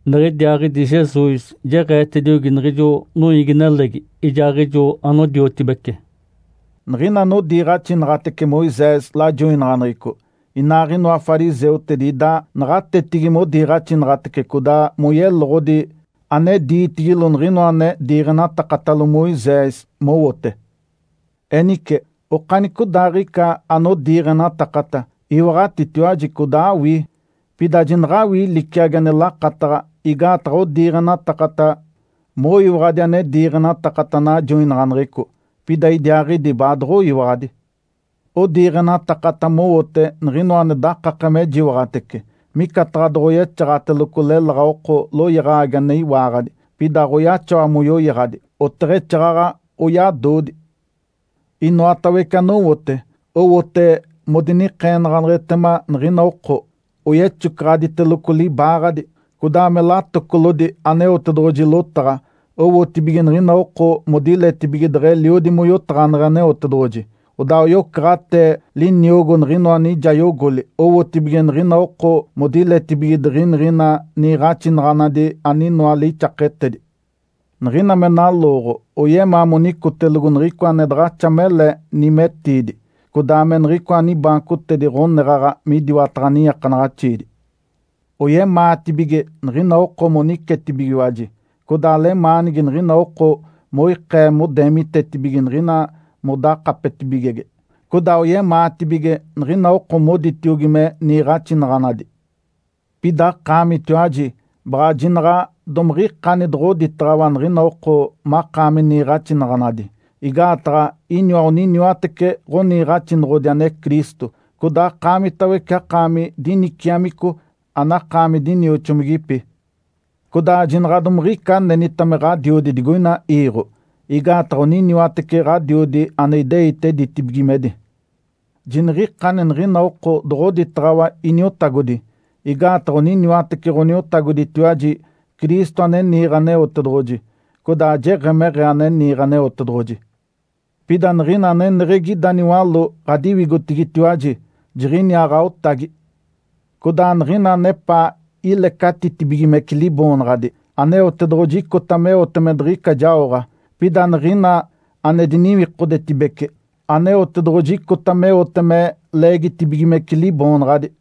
Niɡ̶idiaaɡ̶idi Jesus jeɡ̶eetediogi niɡ̶ijo noiigi-nelegi, ijaaɡ̶ijo anodiotibece, “Niɡ̶ina anodiiɡ̶axinaɡ̶atece Moisés lajoinaɡ̶aneɡ̶eco inaaɡ̶inoa fariseutedi ida naɡ̶atetigi modiiɡ̶axinaɡ̶atece codaa moyeloɡ̶odi ane diitigilo niɡ̶inoa ane diiɡ̶enatakatalo Moisés mowote. Enice, okanicodaaɡ̶ica anodiiɡ̶enatakata, iwaɡ̶atitiwaji codaa awii. Pida jinaɡ̶awii liciagi ane lakataɡ̶a, igaataɡ̶a odiiɡ̶enatakata moyiwaɡ̶adi ane diiɡ̶enatakata najoinaɡ̶aneɡ̶eco, pida idiaaɡ̶idi baadoɡ̶oyiwaɡ̶adi. Odiiɡ̶enatakata mowote niɡ̶inoa ane dakake me jiwaɡ̶atece, micataɡ̶a doɡ̶oyexaɡ̶ateloco leláɡ̶a oko loyaɡ̶agi ane iwaaɡ̶adi, pida aɡ̶oyaxawa moyoyaɡ̶adi, oteɡ̶exaaɡ̶aɡ̶a oyadodi! Inoatawece anowote, owote modinikeenaɡ̶aneɡ̶etema niɡ̶ina oko. Oyexocaɡ̶aditeloco libaaɡ̶adi, codaa me latocolodi Aneotedoɡ̶oji lotaɡ̶a owotibige niɡ̶ina oko modiletibige deɡ̶eliodi moyotaɡ̶aneɡ̶e Aneotedoɡ̶oji, codaa oyocaɡ̶atee liniogo niɡ̶inoa nijayogoli owotibige niɡ̶ina oko modiletibige diɡ̶iniɡ̶ina niiɡ̶axinaɡ̶anadi aninoa lixaketedi. Niɡ̶ina me nalooɡ̶o oyemaa monicotelogo niɡ̶icoa ane daɡ̶axa mele nimetiidi, codaa me niɡ̶icoa nibaancotedi ɡ̶oneɡ̶aɡ̶a midiwataɡ̶a niiakanaɡ̶axiidi. Oyemaatibige niɡ̶ina oko monicetibigiwaji, codaa lemaanigi niɡ̶ina oko moikee modeemitetibige niɡ̶ina modakapetibigege, codaa oyemaatibige niɡ̶ina oko moditiogi me ‘Niiɡ̶axinaɡ̶anadi!’. Pida akaamitiwaji baɡ̶a jinaɡ̶a domiɡ̶ikani doɡ̶oditaɡ̶awa niɡ̶ina oko makaami ‘Niiɡ̶axinaɡ̶anadi’, igaataɡ̶a iniwa oniniwatece ɡ̶aniiɡ̶axinoɡ̶odi ane Cristo. Codaa akaamitawece akaami diniciamico, anakaami dinioxomigipi. Codaa jinaɡ̶a domiɡ̶ica anenita me ɡ̶adiodi digoina iiɡ̶o. Igaataɡ̶a oniniwatece Ǥadiodi, ane ideite ditibigimedi. Jiniɡ̶ikani niɡ̶ina oko doɡ̶oditaɡ̶awa, ‘Iniotagodi’, igaataɡ̶a oniniwatece Ǥaniotagoditiwaji, Cristo ane niiɡ̶e Aneotedoɡ̶oji. Codaa jeɡ̶emeɡ̶ee ane niiɡ̶e Aneotedoɡ̶oji. Pida niɡ̶ina aneneɡ̶egi ida niwaló ɡ̶adiwigotigitiwaji, jiɡ̶iniaa ɡ̶aotagi. Codaa niɡ̶ina anepaa ilecatiditibigimece liboonaɡ̶adi, Aneotedoɡ̶oji icota meote me diɡ̶ica jaoɡ̶a. Pida niɡ̶ina ane diniwikodetibece, Aneotedoɡ̶oji icota meote me leegitibigimece liboonaɡ̶adi.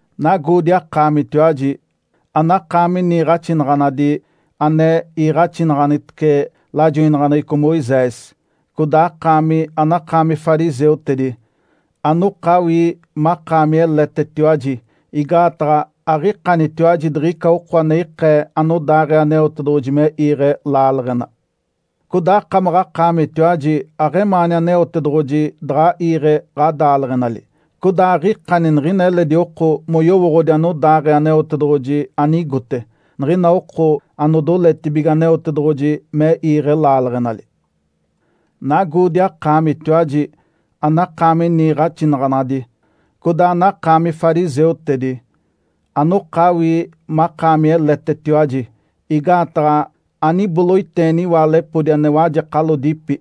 Nagoodi akaamitiwaji, anakaami niiɡ̶axinaɡ̶anadi ane iiɡ̶axinaɡ̶anitece lajoinaɡ̶aneɡ̶eco Moisés, codaa akaami anakaami fariseutedi, anokawii makaami eletetiwaji! Igaataɡ̶a aɡ̶ikanitiwaji diɡ̶ica oko ane ikee anodaaɡ̶ee Aneotedoɡ̶oji me iiɡ̶e laaleɡ̶ena. Codaa akamaɡ̶akaamitiwaji aɡ̶emaani Aneotedoɡ̶oji daɡ̶a iiɡ̶e ɡ̶adaaleɡ̶enali, codaa aɡ̶ikani niɡ̶ina eledi oko moyowooɡ̶odi anodaaɡ̶ee Aneotedoɡ̶oji anigote, niɡ̶ina oko anodoletibige Aneotedoɡ̶oji me iiɡ̶e laaleɡ̶enali. Nagoodi akaamitiwaji, anakaami niiɡ̶axinaɡ̶anadi, codaa anakaami fariseutedi, anokawii makaami eletetiwaji! Igaataɡ̶a aniboloiteeni iwaalepodi ane wajekalodipi,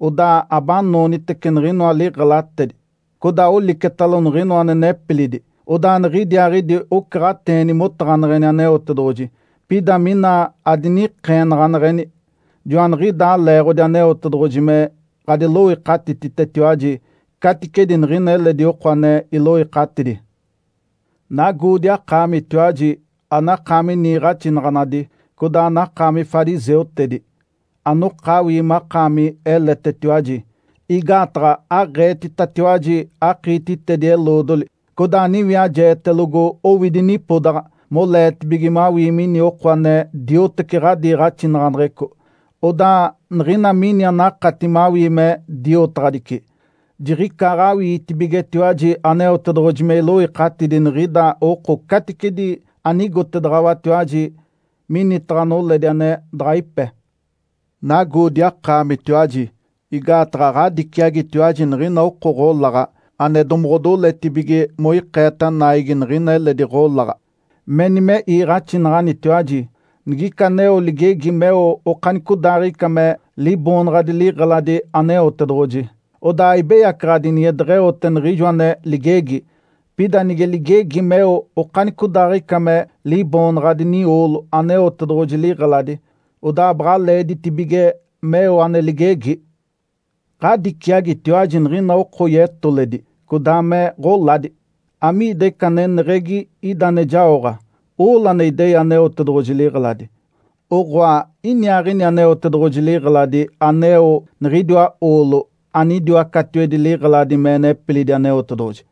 odaa abanoonitece niɡ̶inoa liɡ̶elatedi, codaa olicetalo niɡ̶inoa ane nepilidi. Odaa niɡ̶idiaaɡ̶idi ocaɡ̶ateeni motaɡ̶aneɡ̶eni Aneotedoɡ̶oji, pida mina adinikeenaɡ̶aneɡ̶eni. Joaniɡ̶idaa leeɡ̶odi Aneotedoɡ̶oji me ɡ̶adiloikatititetiwaji caticedi niɡ̶ina eledi oko ane iloikatidi. Nagoodi akaamitiwaji, anakaami niiɡ̶axinaɡ̶anadi codaa anakaami fariseutedi, anokawii makaami eletetiwaji! Igaataɡ̶a aɡ̶eetitatiwaji akiititedi-eloodoli, codaa aniwiajeetelogo owidi nipodaɡ̶a moleetibige mawii mini oko ane dioteci ɡ̶adiiɡ̶axinaɡ̶aneɡ̶eco. Odaa niɡ̶ina mini anakati mawii me diotaɡ̶adici, jiɡ̶icaaɡ̶awiitibigetiwaji Aneotedoɡ̶oji me iloikatidi niɡ̶inida oko caticedi anigotedaɡ̶awatiwaji minitaɡ̶a noledi ane daɡ̶a ipe. Nagoodi akaamitiwaji! Igaataɡ̶a ɡ̶adiciagitiwaji niɡ̶ina oko ɡ̶olaɡ̶a ane domoɡ̶odoletibige moikeeta naigi niɡ̶ina eledi ɡ̶olaɡ̶a. Meni me iiɡ̶axinaɡ̶anitiwaji, ‘Nigica aneo ligegi meo okanicodaaɡ̶ica me liboonaɡ̶adi liɡ̶eladi Aneotedoɡ̶oji, odaa aibeyacaɡ̶adi nige deɡ̶eote niɡ̶ijo ane ligegi. Pida nige ligegi meo okanicodaaɡ̶ica me liboonaɡ̶adi nioolo Aneotedoɡ̶oji liɡ̶eladi, odaa baɡ̶a leeditibige meo ane ligegi.’ Ǥadiciagitiwaji niɡ̶ina oko yetoledi codaa me ɡ̶oladi! Amiida ica aneneɡ̶egi ida ane jaoɡ̶a, oolo ane idei Aneotedoɡ̶oji liɡ̶eladi, oɡ̶oa iniaaɡ̶ini Aneotedoɡ̶oji liɡ̶eladi aneo niɡ̶idiwa oolo anidiwa catiwedi liɡ̶eladi me nepilidi Aneotedoɡ̶oji?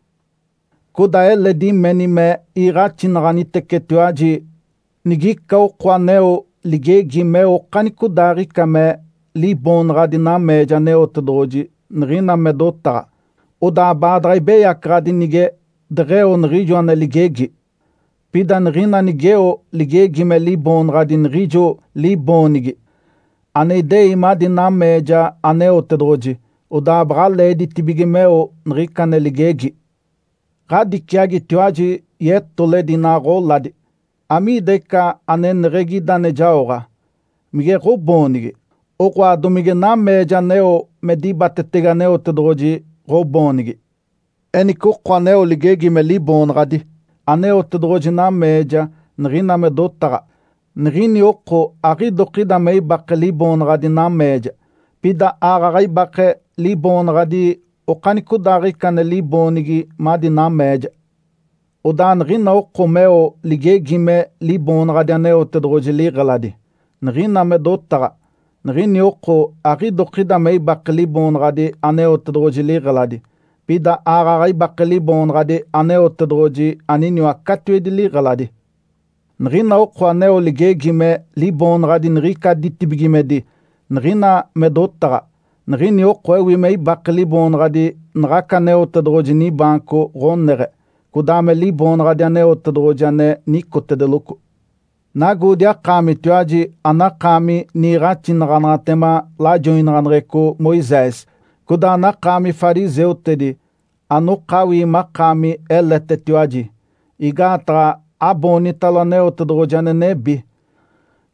Codaa eledi meni me iiɡ̶axinaɡ̶anitecetiwaji, ‘Nigica oko aneo ligegi meo okanicodaaɡ̶ica me liboonaɡ̶adi nameeja Aneotedoɡ̶oji niɡ̶ina me dotaɡ̶a, odaa baadaɡ̶a ibeyacaɡ̶adi nige deɡ̶eo niɡ̶ijo ane ligegi. Pida niɡ̶ina nigeo ligegi me liboonaɡ̶adi niɡ̶ijo liboonigi ane idei madi nameeja Aneotedoɡ̶oji, odaa baɡ̶a leeditibige meo niɡ̶ica ane ligegi.’ Ǥadiciagitiwaji yetoledi inaa ɡ̶oladi! Amiida ica aneneɡ̶egi ida ane jaoɡ̶a, mige ɡ̶oboonigi, oɡ̶oa, domige nameeja aneo me dibatetege Aneotedoɡ̶oji ɡ̶oboonigi? Enice oko aneo ligegi me liboonaɡ̶adi Aneotedoɡ̶oji nameeja niɡ̶ina me dotaɡ̶a, niɡ̶ini oko aɡ̶idokida me ibake liboonaɡ̶adi nameeja, pida aaɡ̶aɡ̶a ibake liboonaɡ̶adi okanicodaaɡ̶ica ane liboonigi madi nameeja. Odaa niɡ̶ina oko meo ligegi me liboonaɡ̶adi Aneotedoɡ̶oji liɡ̶eladi, niɡ̶ina me dotaɡ̶a, niɡ̶ini oko aɡ̶idokida me ibake liboonaɡ̶adi Aneotedoɡ̶oji liɡ̶eladi, pida aaɡ̶aɡ̶a ibake Liboonaɡ̶adi Aneotedoɡ̶oji aniniwa catiwedi liɡ̶eladi. Niɡ̶ina oko aneo ligegi me liboonaɡ̶adi niɡ̶ica ditibigimedi, niɡ̶ina me dotaɡ̶a, niɡ̶ini oko ewi me ibake liboonaɡ̶adi naɡ̶aca Aneotedoɡ̶oji nibaanco ɡ̶oneɡ̶e, codaa me Liboonaɡ̶adi Aneotedoɡ̶oji, ane nicotedeloco. Nagoodi akaamitiwaji anakaami niiɡ̶axinaɡ̶anaɡ̶atema lajoinaɡ̶aneɡ̶eco Moisés codaa anakaami fariseutedi anokawii makaami eletetiwaji! Igaataɡ̶a aboonitalo Aneotedoɡ̶oji ane nebi,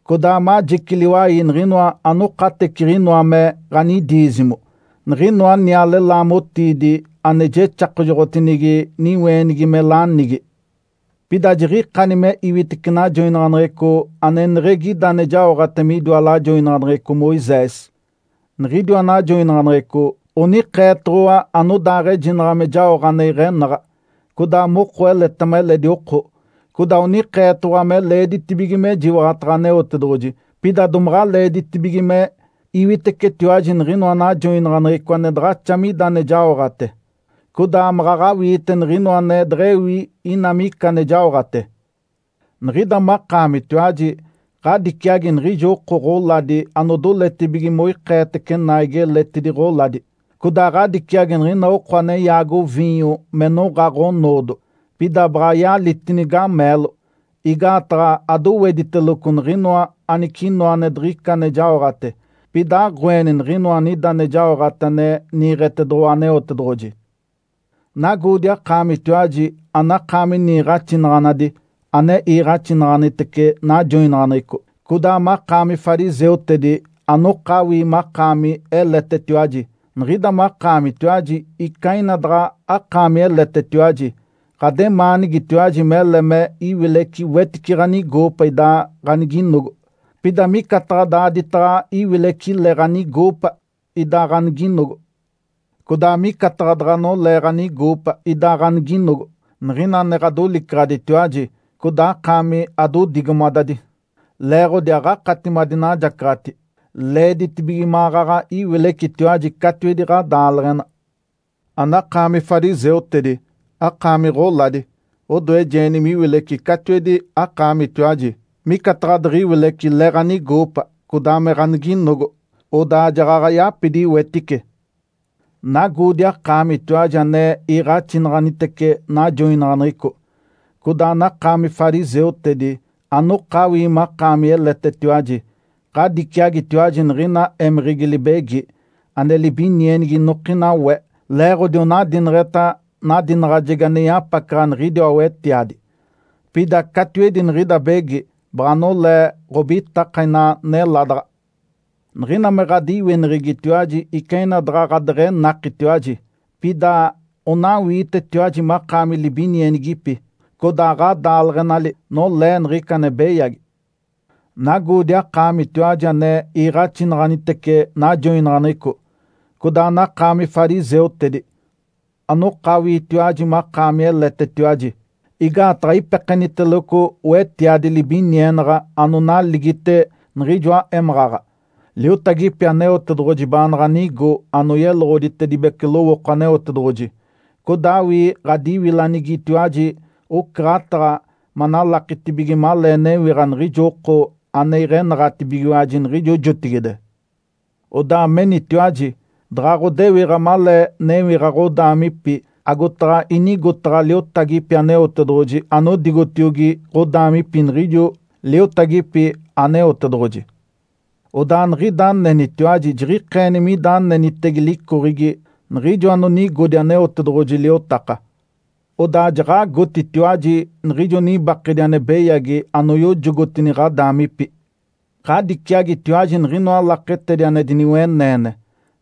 codaa majici liwai niɡ̶inoa anokateciɡ̶inoa me ɡ̶anidiizimo, niɡ̶inoa niale laamotiidi ane jexakajoɡ̶otinigi niweenigi me lanigi. Pida jiɡ̶ikani me iwitece najoinaɡ̶aneɡ̶eco aneneɡ̶egi ida ane jaoɡ̶ate midiwa lajoinaɡ̶aneɡ̶eco Moisés. Niɡ̶idiwa najoinaɡ̶aneɡ̶eco onikeetoɡ̶owa anodaaɡ̶ejinaɡ̶a me jaoɡ̶a ane iɡ̶enaɡ̶a, codaa moko eletema eledi oko, codaa onikeetoɡ̶owa me leeditibige mejiwaɡ̶ataɡ̶a Aneotedoɡ̶oji. Pida domaɡ̶a leeditibige me iwitecetiwaji niɡ̶inoa najoinaɡ̶aneɡ̶eco ane daɡ̶axa mida ane jaoɡ̶ate, codaa maɡ̶aɡ̶a awiite niɡ̶inoa ane deɡ̶ewi ina mica ane jaoɡ̶ate. Niɡ̶ida makaamitiwaji ɡ̶adiciagi niɡ̶ijo oko ɡ̶oladi anodoletibige moikeetece naigi eletidi ɡ̶oladi. Codaa ɡ̶adiciagi niɡ̶ina oko ane yaago viinyo me noɡ̶a ɡ̶onoodo, pida baɡ̶a yalitini gameelo, igaataɡ̶a adowetiteloco niɡ̶inoa anicinoa ane diɡ̶ica ane jaoɡ̶ate, pida aɡ̶oeni niɡ̶inoa anida ane jaoɡ̶ate ane niiɡ̶etedoɡ̶owa Aneotedoɡ̶oji. Nagoodi akaamitiwaji anakaami niiɡ̶axinaɡ̶anadi ane iiɡ̶axinaɡ̶anitece najoinaɡ̶aneɡ̶eco, codaa makaami fariseutedi, anokawii makaami eletetiwaji! Niɡ̶ida makaamitiwaji ica ina daɡ̶a akaami eletetiwaji, ɡ̶ademaanigitiwaji mele me iwileci wetice ɡ̶anigoopa idaa ɡ̶aniginogo, pida micataɡ̶a daaditaɡ̶a iwileci le ɡ̶anigoopa idaa ɡ̶aniginogo. Codaa micataɡ̶a daɡ̶a nolee ɡ̶anigoopa idaa ɡ̶aniginogo niɡ̶ina ane ɡ̶adolicaɡ̶aditiwaji codaa akaami adodigomadadi, leeɡ̶odi aɡ̶akati madinajacaɡ̶ati. Leeditibige maɡ̶aɡ̶a iwilecitiwaji catiwedi ɡ̶adaaleɡ̶ena. Anakaami fariseutedi, akaami ɡ̶oladi! Odoejeeni miwileci catiwedi akaamitiwaji, micataɡ̶a diɡ̶iwileci le ɡ̶anigoopa codaa me ɡ̶aniginogo, odaa jaɡ̶aɡ̶a yapidi wetice. Nagoodi akaamitiwaji ane iiɡ̶axinaɡ̶anitece najoinaɡ̶aneɡ̶eco, codaa anakaami fariseutedi, anokawii makaami eletetiwaji! Ǥadiciagitiwaji niɡ̶ina émeɡ̶egi libegi, ane libinienigi inokina we, leeɡ̶odi onadineɡ̶eta nadinaɡ̶ajegi ane yapacaɡ̶a niɡ̶idiwa wetiadi. Pida catiwedi niɡ̶ida begi, baɡ̶a nolee ɡ̶obitaka inaa neladaɡ̶a. Niɡ̶ina me ɡ̶adiwineɡ̶egitiwaji ica ina daɡ̶a ɡ̶adeɡ̶enakitiwaji, pida onawiitetiwaji makaami libinienigipi, codaa ɡ̶adaaleɡ̶enali nolee niɡ̶ica ane beyagi. Nagoodi akaamitiwaji ane iiɡ̶axinaɡ̶anitece najoinaɡ̶aneɡ̶eco, codaa anakaami fariseutedi, anokawiitiwaji makaami eletetiwaji! Igaataɡ̶a ipekeniteloco wetiadi libinienaɡ̶a anonaligite niɡ̶ijoa émaɡ̶aɡ̶a, liotagipi Aneotedoɡ̶oji baanaɡ̶a nigo anoyeloɡ̶oditedibece lowooko Aneotedoɡ̶oji. Codaa awii ɡ̶adiwilanigitiwaji ocaɡ̶ataɡ̶a manalakitibige malee newiɡ̶a niɡ̶ijo oko ane iɡ̶enaɡ̶atibigiwaji niɡ̶ijo jotigide. Odaa menitiwaji, ‘Daɡ̶a ɡ̶odewiɡ̶a malee newiɡ̶a ɡ̶odaamipi, agotaɡ̶a inigotaɡ̶a liotagipi Aneotedoɡ̶oji anodigotiogi ɡ̶odaamipi niɡ̶ijo liotagipi Aneotedoɡ̶oji.’ Odaa niɡ̶ida anenitiwaji jiɡ̶ikeeni mida anenitege licoɡ̶egi niɡ̶ijo anonigodi Aneotedoɡ̶oji liotaka. Odaa jaɡ̶agotitiwaji niɡ̶ijo nibakedi ane beyagi anoyojogotini ɡ̶adaamipi. Ǥadiciagitiwaji niɡ̶inoa laketedi ane diniweneene.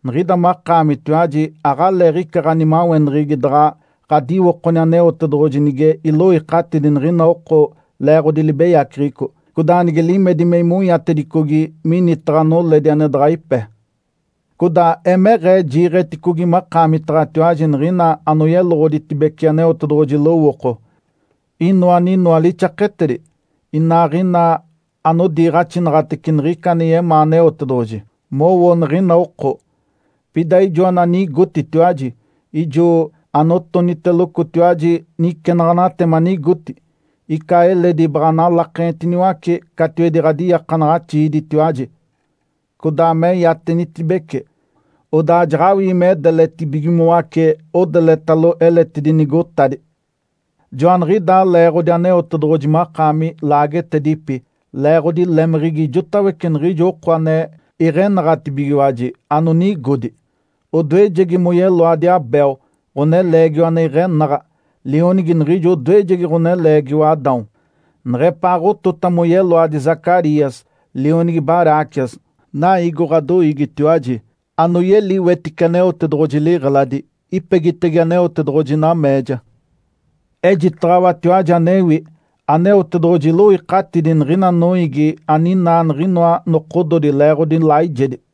Niɡ̶ida makaamitiwaji aɡ̶aleeɡ̶ica ɡ̶animaweneɡ̶egi daɡ̶a ɡ̶adiwokoni Aneotedoɡ̶oji nige iloikatidi niɡ̶ina oko leeɡ̶odi libeyaceɡ̶eco, codaa nige limedi me imonyatedicogi minitaɡ̶a noledi ane daɡ̶a ipe. Codaa Emeɡ̶ee jiiɡ̶eticogi makaamitaɡ̶atiwaji niɡ̶ina anoyeloɡ̶oditedibece Aneotedoɡ̶oji lowooko, inoa aninoa lixaketedi, inaaɡ̶ina anodiiɡ̶axinaɡ̶atece niɡ̶ica ane yemaa Aneotedoɡ̶oji mowo niɡ̶ina oko. Pida ijo ananigotitiwaji, ijo anotonitelocotiwaji nicenaɡ̶anaɡ̶ate manigoti. Ica eledi baɡ̶a analakenitiniwace catiwedi ɡ̶adiiakanaɡ̶axiiditiwaji, codaa me iatenitibece, odaa jaɡ̶awii me daleditibigimoace odeletalo eletidi nigotadi. Joaniɡ̶idaa leeɡ̶odi Aneotedoɡ̶oji makaami laagetedipi leeɡ̶odi lemeɡ̶egi ijotawece niɡ̶ijo oko ane iɡ̶enaɡ̶atibigiwaji anonigodi, odoejegi moyeloadi Abel ɡ̶oneleegiwa ane iɡ̶enaɡ̶a, lionigi niɡ̶ijo odoejegi ɡ̶oneleegiwa Adão, neɡ̶epaaɡ̶otota moyeloadi Zacarias, lionigi Baraquias, naiigo ɡ̶adoiigitiwaji, anoyeli wetice Aneotedoɡ̶oji liɡ̶eladi, ipegitege Aneotedoɡ̶oji nameeja. Ejitaɡ̶awatiwaji anewi. Aneotedoɡ̶oji iloikatidi niɡ̶ina noiigi aninaa niɡ̶inoa nokododi leeɡ̶odi laijedi.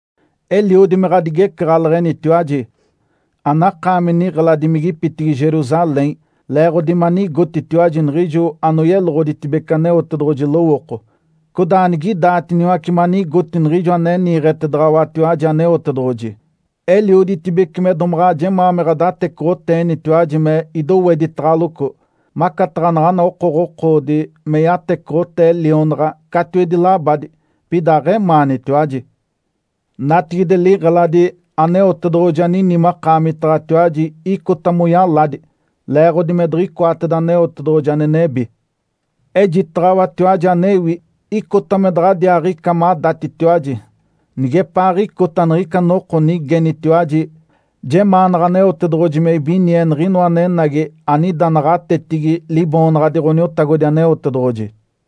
Eliodi me ɡ̶adigecaɡ̶aleɡ̶enitiwaji, anakaami niɡ̶eladimigipitigi Jerusalém! Leeɡ̶odi manigotitiwaji niɡ̶ijo anoyeloɡ̶oditedibece Aneotedoɡ̶oji lowooko, codaa anigidaatiniwace manigoti niɡ̶ijo ane niiɡ̶etedaɡ̶awatiwaji Aneotedoɡ̶oji. Elioditibece me domaɡ̶a jemaa me ɡ̶adatecoɡ̶oteenitiwaji me idoweditaɡ̶aloco, macataɡ̶a naɡ̶ana okoɡ̶okoodi me yatecoɡ̶otee lionaɡ̶a catiwedi labadi, pida aɡ̶emaanitiwaji. Natigide, liɡ̶eladi Aneotedoɡ̶oji anini makaamitaɡ̶atiwaji icota moyaladi, leeɡ̶odi me diɡ̶icoateda Aneotedoɡ̶oji ane nebi. Ejitaɡ̶awatiwaji anewi. Icota me daɡ̶adiaaɡ̶ica madatitiwaji nigepaaɡ̶icota niɡ̶ica noko nigenitiwaji, ‘Jemaanaɡ̶a Aneotedoɡ̶oji me ibinie Niɡ̶inoa anenagi anida naɡ̶atetigi Liboonaɡ̶adi Ǥoniotagodi Aneotedoɡ̶oji.’”